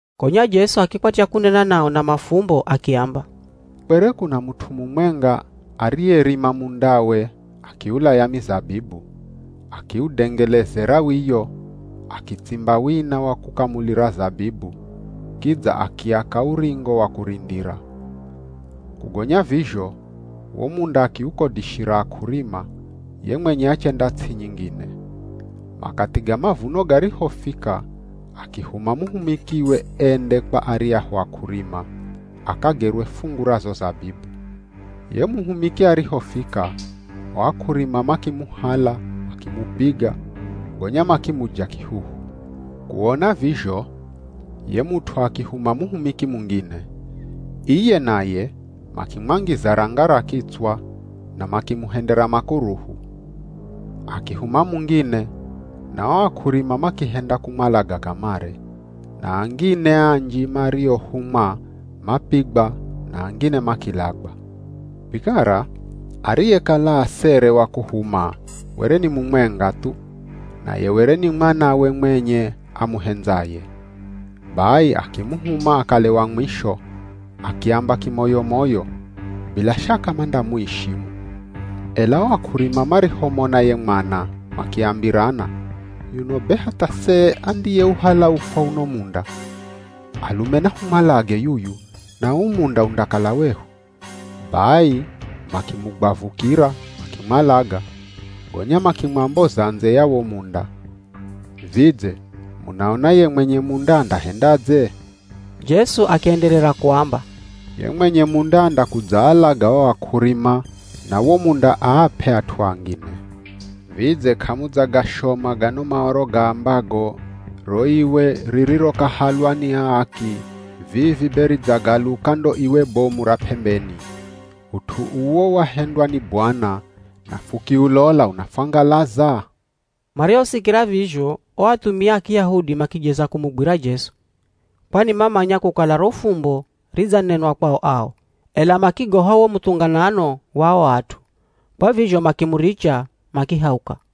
Gonya Jesu akikwatya kunena nao na mafumbo akiamba, “Kwere kuna mut'u mumwenga ariyerima mundawe akiulaya mizabibu, akiudengelezera wiyo, akitsimba wina wa kukamulira zabibu, kidza akiaka uringo wa kurindira. Kugonya vizho, wo munda akiukodishira ak'urima, ye mwenye achenda ts'i nyingine. Makathi ga mavuno garihofika akihuma muhumikiwe ende kwa aryahu ak'urima, akagerwe fungu ra zo zabibu. Ye muhumiki arihofika, o ak'urima makimuhala makimupiga, gonya makimuja kihuhu. Kuona vizho, ye mut'u akihuma muhumiki mungine. Iye naye makimwangiza ranga ra kitswa na makimuhendera makuruhu. Akihuma mungine, na o ak'urima makihenda kumwalaga kamare, na angine anji mariohumwa mapigwa na angine makilagwa. “Vikara ariyekala asere wa kumuhuma were ni mumwenga thu. Naye were ni mwanawe mwenye amuhendzaye. Bai akimuhuma akale wa mwisho, akiamba kimoyo-moyo, ‘Bila shaka mandamuishimu.’ “Ela o ak'urima marihomona ye mwana, makiambirana, ‘Yuno be hatha se andiyeuhala ufwa uno munda? Alume nahumwalage yuyu, na uu munda undakala wehu.’ Bai makimugwavukira makimwalaga, gonya makimwamboza ndze ya wo munda. “Vidze munaona ye mwenye munda andahendadze?” Jesu akienderera kuamba, “Ye mwenye munda andakudzaalaga o ak'urima na wo munda aap'e at'u angine. Vidze k'amudzagashoma gano Maoro gaambago, ‘Ro iwe ririrokahalwa ni aaki vivi be ridzagaluka ndo iwe bomu ra p'embeni. Ut'u uwo wahendwa ni Bwana, Na fukiulola unafwangalaza?’” Marihosikira vizho o athumia a Kiyahudi makijeza kumugwira Jesu, kwani mamanya kukala ro fumbo ridzanenwa kwao ao, ela makigoha wo muthunganano wa o at'u. Kwa vizho makimuricha makihauka.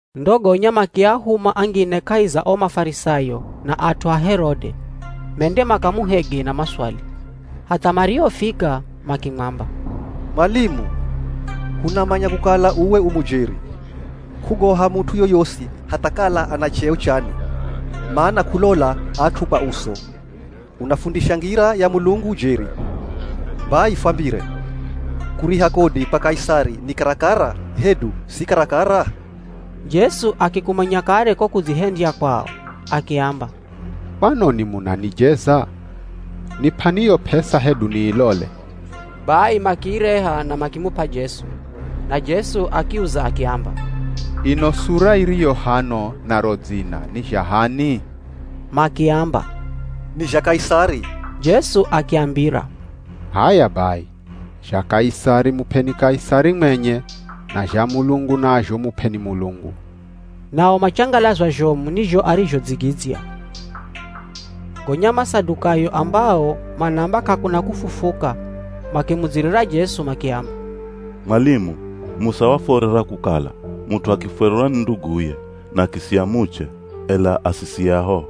Ndo gonya makiahuma angine kahi za o Mafarisayo na at'u a Herode, mende makamuhege na maswali. Hatha marihofika makimwamba, “Mwalimu, hunamanya kukala uwe u mujeri. K'ugoha mut'u yoyosi hatha kala ana cheo chani, mana k'ulola at'u kwa uso. Unafundisha ngira ya Mulungu jeri. Bai fwambire. Kuriha kodi kwa Kaisari ni karakara hedu si karakara?” Jesu akikumanya kare ko kudzihendya kwao, akiamba, “Kwanoni munanijeza? Nip'ani yo p'esa hedu niilole.” Bai makiireha na makimup'a Jesu. Na Jesu akiuza akiamba, “Ino sura iriyo hano na ro dzina ni zha h'ani?” Makiamba, “Ni zha Kaisari.” Jesu akiambira, “H'aya bai, zha Kaisari mup'eni Kaisari mwenye, na zha Mulungu nazho mup'eni Mulungu.” Nao machangalazwa zhomu ni zho arizhodzigidzya. Gonya Masadukayo ambao manaamba k'akuna kufufuka makimudzirira Jesu makiamba, “Mwalimu, Musa wafuorera kukala, mut'u akifwererwa ni nduguye, na akisiya muche ela asisiye ahoho,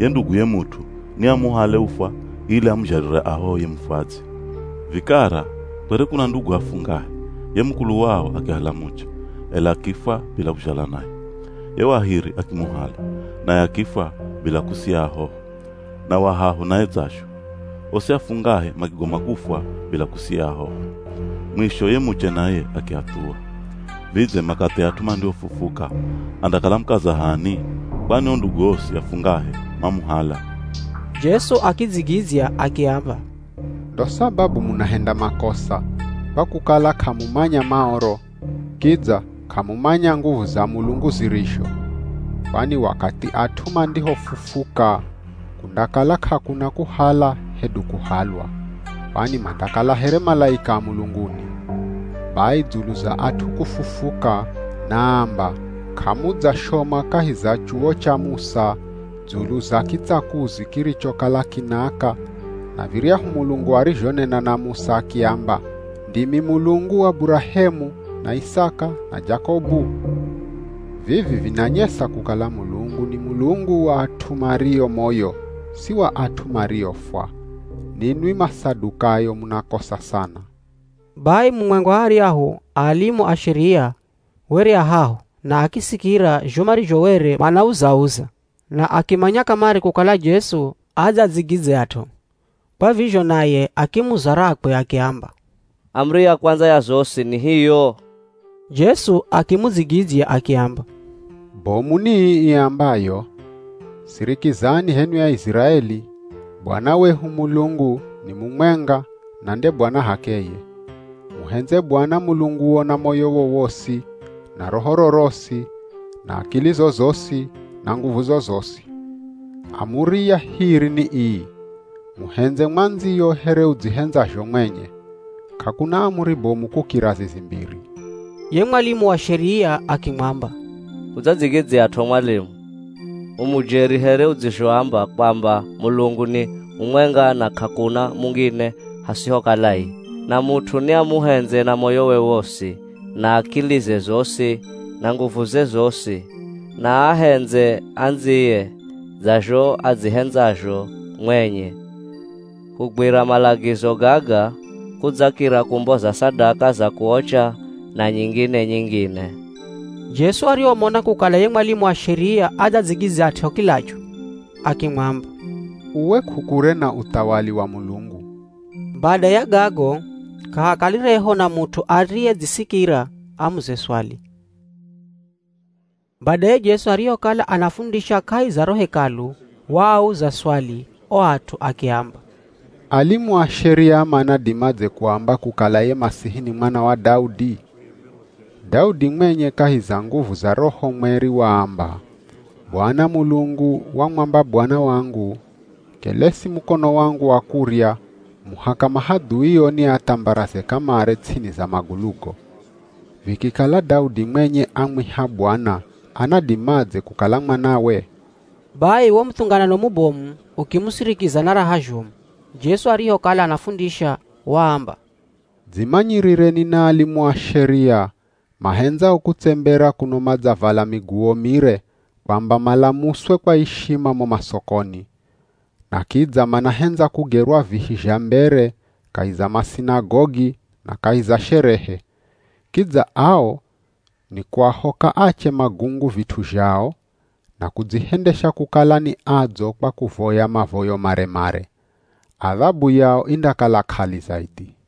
ye nduguye mut'u ni amuhale ufwa ili amuzhalire ahoho ye mufwadzi. Vikara kwere kuna ndugu afungahe, ye mukulu wao akihala muche, ela akifwa bila kuzhala naye. Ye wa hiri akimuhala, naye akifwa bila kusiya ahoho, na wa hahu naye dzazho. Osi afungahe makigoma kufwa bila kusiya ahoho. Mwisho ye muche naye akiathuwa. Vidze makathi at'u mandihofufuka, andakala mukaza h'ani? Kwani o ndugu osi afungahe mamuhala.” Jesu akidzigidzya akiamba, “Ndo sababu munahenda makosa, kwa kukala k'amumanya Maoro, kidza k'amumanya nguvu za Mulungu zirizho. Kwani wakathi at'u mandihofufuka kundakala k'akuna kuhala hedu kuhalwa, kwani mandakala here malaika a mulunguni. Bai dzulu za at'u kufufuka, naamba, k'amudzashoma kahi za chuwo cha Musa dzulu za kitsakuzi kirichokala kinaaka na viryahu Mulungu arizhonena na Musa akiamba, ‘Ndimi Mulungu wa Burahemu, na Isaka, na Jakobu’? Vivi vinanyesa kukala Mulungu ni Mulungu wa at'u mario moyo si wa at'u mariofwa. Ninwi Masadukayo munakosa sana.” Bai mumwenga wa aryahu a alimu a Sheria were a haho na akisikira zho marizho were manauza-uza na akimanya kamare kukala Jesu adzadzigidzyat'o. Kwa vizho naye akimuza rakwe akiamba, “Amuri ya kwandza ya zosi ni hiyo?” Jesu akimudzigidzya akiamba, “Bomu ni ii iambayo, ‘Sirikizani h'enwi Aiziraeli, Bwana wehu Mulungu ni mumwenga na nde Bwana h'akeye. Muhendze Bwana Mulunguo na moyowo wosi, na rohoro rosi, na akilizo zosi, na nguvuzo zosi.’ Amuri ya hiri ni ii, ‘Muhendze mwandziyo here udzihendzazho mwenye.’ K'akuna amuri bomu kukira zizi mbiri.” Ye mwalimu wa Sheria akimwamba, “Udzadzigidzyat'o mwalimu. U mujeri here udzizhoamba kwamba Mulungu ni mumwenga na k'akuna mungine hasihokala iye. Na mut'u ni amuhendze na moyowe wosi na akilize zosi na nguvuze zosi na aahendze andziye dza zho adzihendzazho mwenye. Kugwira malagizo gaga kudzakira kumboza sadaka za kuocha na nyingine-nyingine.” Jesu arihomona kukala ye mwalimu wa Sheria adzadzigidzyat'o kilachu, akimwamba, “Uwe k'ukure na uthawali wa Mulungu.” Bada ya gago k'ahakalireho na mut'u ariyedzisikira amuze swali. Badaye Jesu arihokala anafundisha kahi za ro Hekalu, waauza swali o at'u akiamba, “Alimu a Sheria manadimadze kuamba kukala ye Masihi ni Mwana wa Daudi? Daudi mwenye kahi za nguvu za Roho Mweri waamba, ‘Bwana Mulungu wamwamba Bwana wangu, “Kelesi mukono wangu wa kurya, muhaka mahadhuio niathambaraze kamare ts'ini za magulugo.” ’ Vikikala Daudi mwenye amwiha ‘Bwana,’ anadimadze kukala mwanawe?” Bai wo muthunganano mubomu ukimusirikiza na raha zhomu. Jesu arihokala anafundisha waamba, “Dzimanyirireni na alimu a Sheria mahendzao kutsembera kuno madzavala miguwo mire kwamba malamuswe kwa ishima mo masokoni, na kidza manahendza kugerwa vihi zha mbere kahi za masinagogi na kahi za sherehe. Kidza ao nikuahoka ache magungu vit'u zhao, na kudzihendesha kukala ni adzo kwa kuvoya mavoyo mare-mare. Adhabu yao indakala k'ali zaidhi.”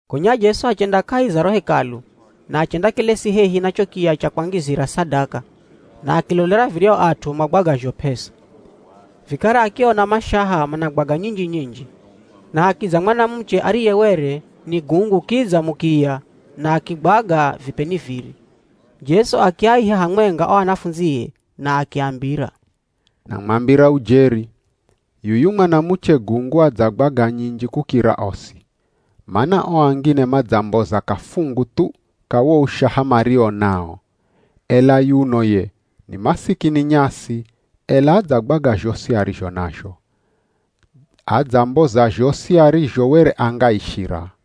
Gonya Jesu achenda kahi za ro Hekalu na achendakelesi hehi na cho kiya cha kwangizira sadaka na akilolera viryahu at'u magwagazho p'esa. Vikara akiona mashaha managwaga nyinji-nyinji. Na hakidza mwanamuche ariye were ni gungu kidza mukiya na akigwaga vipeni viri. Jesu akiaiha hamwenga o anafundzie na akiambira, “Namwambira ujeri, yuyu mwanamuche gungu adzagwaga nyinji kukira osi. Mana o angine madzamboza kafungu thu ka wo ushaha mario nao, ela yuno ye, ni masikini nyasi, ela adzagwaga zhosi arizho nazho. Adzamboza zhosi arizho were angaishira.”